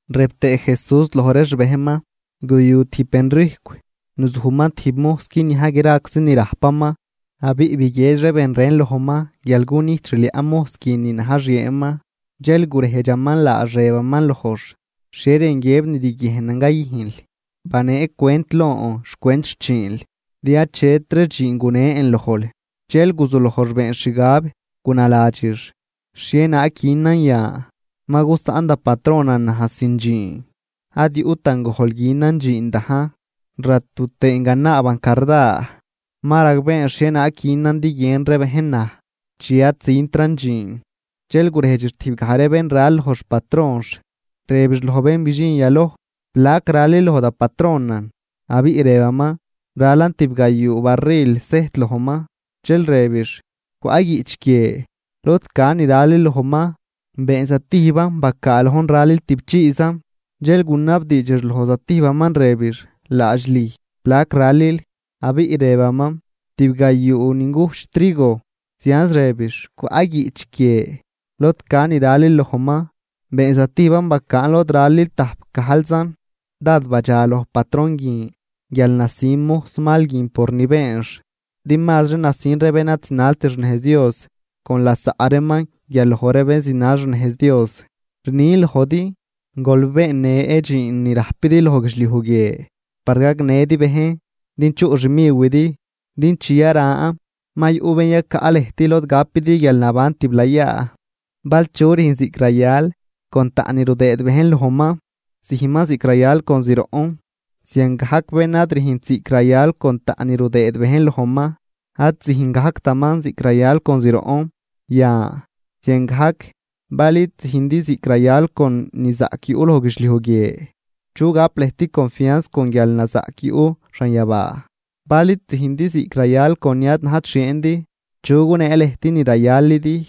Rëb tëë Jesús loj ree xbejnman: ―Guyu tijb benrijcw, nuzujman tijb mojs guinia graczi ni rajpaman. Abiꞌ biguiedx ree ben ren lojman guial cunijt xliaꞌ mojs guin ni na̱j xieenman. Dxel gurejdxaman laax rëbaman lojx: “¿Xhie rën guiëb ni riguiejnan cayüjnl? Banee cwent lon xcwent xchiinl, din achetri dxiin gunen lojl.” Dxel guzuloj beenx xgab gunaladxix: “¿Xhienaag günan yan ma gusaꞌn da patronan naj sin dxiin? Ad yuꞌtan gojl günan dxiin dajn, ratu tëën ganaaban carda. Ma ragbeen xhienaag günan din guiën ree bejn naj chi ad züntran dxiin.” Dxel gurejdxix tijb gaj ree bén ral loj xpatronx, rëbix loj bén bidxin yaloj: “¿Plac ralil loj da patronan?” Abiꞌ rëbaman: “Ralan tibgayuu barril sejt lojman.” Dxel rëbix: “Cwaꞌ guiꞌch guie lod ca ni ralil lojman, been zatijban bacaa lojn ralil tüꞌpchiizan.” Dxel gunabdiidxix loj zatijbaman rëbix: “Laadx lüj, ¿plac ralil?” Abiꞌ rëbaman: “Tib gayuu ingujch trigo.” Zianz rëbix: “Cwaꞌ guiꞌch guie lod ca ni ralil lojman, been zatijban bacaa lojn ralil tajpgajlzan.” Dád badxaloj patron guin guial nasin mojs mal guin por ni beenx. Din mazri nasin ree bén ad zinalt xnejz Dios con lasaꞌ reeman guial loj ree bén zinal xnejz Dios. ’Rnin lojdi, gol beennë dxiin ni rajpidi loj guidxliuj guie par gagnëdi bejn din chuꞌ xmiwidi, din chi yaran ma yuꞌ bén yacaꞌ lëjt lod gapidi guialnaban tiblayaa. ’Bal chu rüjn ziꞌc rayal con taꞌn ni rudëëd bejn lojman, züjnman ziꞌc rayal con zroꞌn. Ziangajc bén ad rüjnt ziꞌc rayal con taꞌn ni rudëëd bejn lojman, ad züjn gajctaman ziꞌc rayal con zroꞌn. Yan, ziangajc bal id züjndi ziꞌc rayal con ni zaꞌc yuꞌ loj guidxliuj guie, ¿chu gap lëjt confianz con guialnazaꞌc yuꞌ xanyabaa? Bal id züjndi ziꞌc rayal con ni ad najt xieendi, ¿chu gunee lëjt ni rayalidi?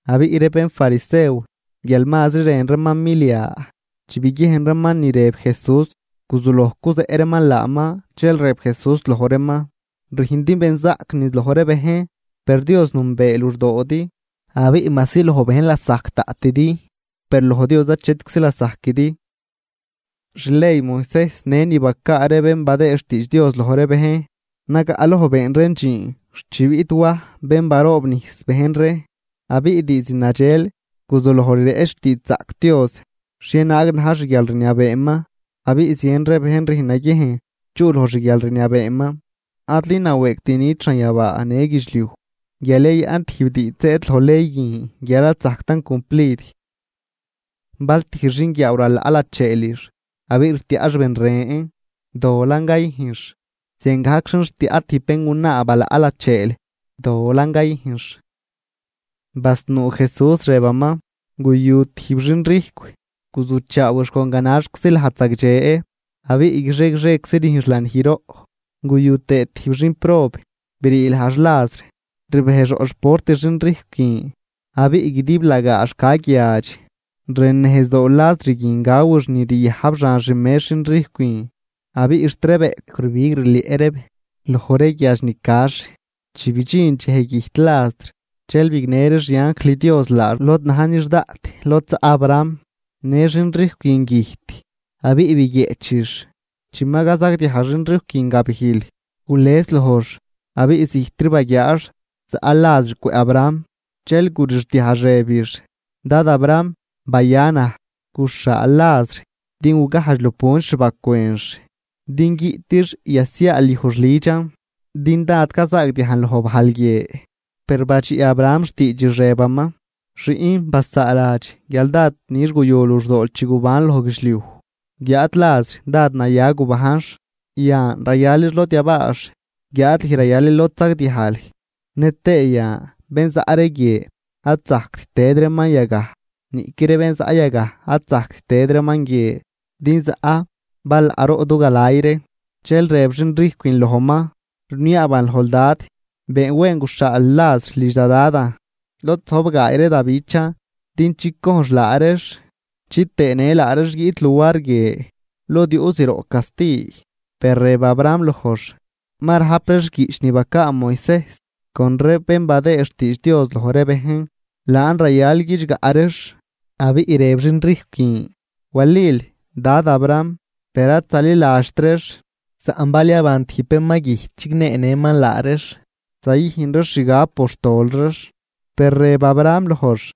Abiꞌ ree bénfarisew guial mazri rën reeman milia, chi biguiejn reeman ni rëb Jesús guzuloj cuzeꞌ reeman laaman. Dxel rëb Jesús loj reeman: ―Rüjndi benzaꞌc niz loj ree bejn, per Dios nünbee luxdoodi; abiꞌ majsi loj bejn lasajc daꞌtidi, per loj Dios achet lasajquidi. ’Xley Moisejs në ni bacaa ree bén badëë xtiidx Dios loj ree bejn, nagaꞌloj been reen dxiin xt chi biꞌt Waj bén baroobnijs bejn ree. Abiꞌ diizd nadxel guzuloj rireꞌch xtiidxzaꞌc Dios xhienaag na̱j xguialrniabeeman, abiꞌ zien ree bejn rüjn naguiejn chuꞌ loj xguialrniabeeman. ’Adli nawëëgt nit xanyabaa në guidxliuj, guial yayaꞌn tijb diidx zëëd loj ley guin guial ad zajctan cumplid. ’Bal tijb xinguiaaw ralaꞌ lacheelix abiꞌ rtiaꞌx ben ren, dolan cayüjnx. Ziangajc xin rtiaꞌ tijb béngunaa balaꞌ lacheel, dolan cayüjnx. Basnuu Jesús, rëbaman: ―Guyu tijb xinrijcw, guzujchaawix con ganaxczi lajd zagdxe, abiꞌ guixie guixieczi rüjnx lanijroꞌ. Guyu tëë tijb xinprob brii lajx Lazr, rbejx roꞌ xport xinrijcw guin abiꞌ guidiblagaax ca guiadx. Rën nejzdoo Lazr guin gawix ni riajb xan xmex xinrijcw guin. Abiꞌ xt ree bëꞌcw rbig rlieꞌ reeb loj ree guiadx ni cax. ’Chi bidxin dxej güjt Lazr dxel bignë ree xianjl Dios laax lod na̱j nix daꞌt, lod zaꞌ Abraham. Në xin rijcw guin güjt, abiꞌ biguieꞌchix. Chi ma cazagdiaj xin rijcw guin gabijl, gules lojx abiꞌ zijtri baguiaax zaꞌ Lazr cwëꞌ Abraham. Dxel gurixdiajx rëbix: “Dad Abraham, baya naj, guxhaal Lazr din gugajdx lupunt xbacwënx din guiꞌtix yasiaalyujx lüdxan, din dád cazaagdiajn loj bajl guie.” Per badxiꞌ Abraham xtiidxix rëbaman: “Xiꞌn, basaaladx guial dád nix guyu luxdool chi gubanl loj guidxliuj, guiáad Lazr dád naya gubajnx. Yan, rayalix lod yabaax guiáad lüj rayalil lod sagdiajl. Nëtëë yan bén zaꞌ ree guie ad zajct tëd reeman yagaj, niꞌqui ree bén zaꞌ yagaj ad zajct tëd reeman guie, din zaꞌ balaꞌroꞌ du galay ree.” ’Dxel rëb xinrijcw guin lojman: “Rniaaban lojl dad, been wen guxhaal Lazr lidx da dadan, lod zojb gaay ree da bichan din chicojnx laa reex chitëë në laa reex guiꞌt luar guie, lod yuꞌ zroꞌ casti.” Per rëb Abraham lojx: “Ma rajp reex guiꞌch ni bacaa Moisejs con ree bén badëë xtiidx Dios loj ree bejn, laan rayal guidxgaꞌ reex.” Abiꞌ rëb xinrijcw guin: “Walil, dad Abraham, per ad zaliladxt reex, saꞌn bal yaban tijb bén ma güjt chigneenëman laa reex, zayüjn reex xgab por xtol reex.” Per rëb Abraham lojx: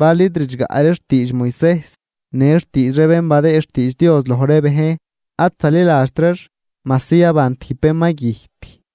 “Bal id ridxgaꞌ reex xtiidx Moisejs në xtiidx ree bén badëë xtiidx Dios loj ree bejn, ad zaliladxt reex majsi yaban tijb bén ma güjt.”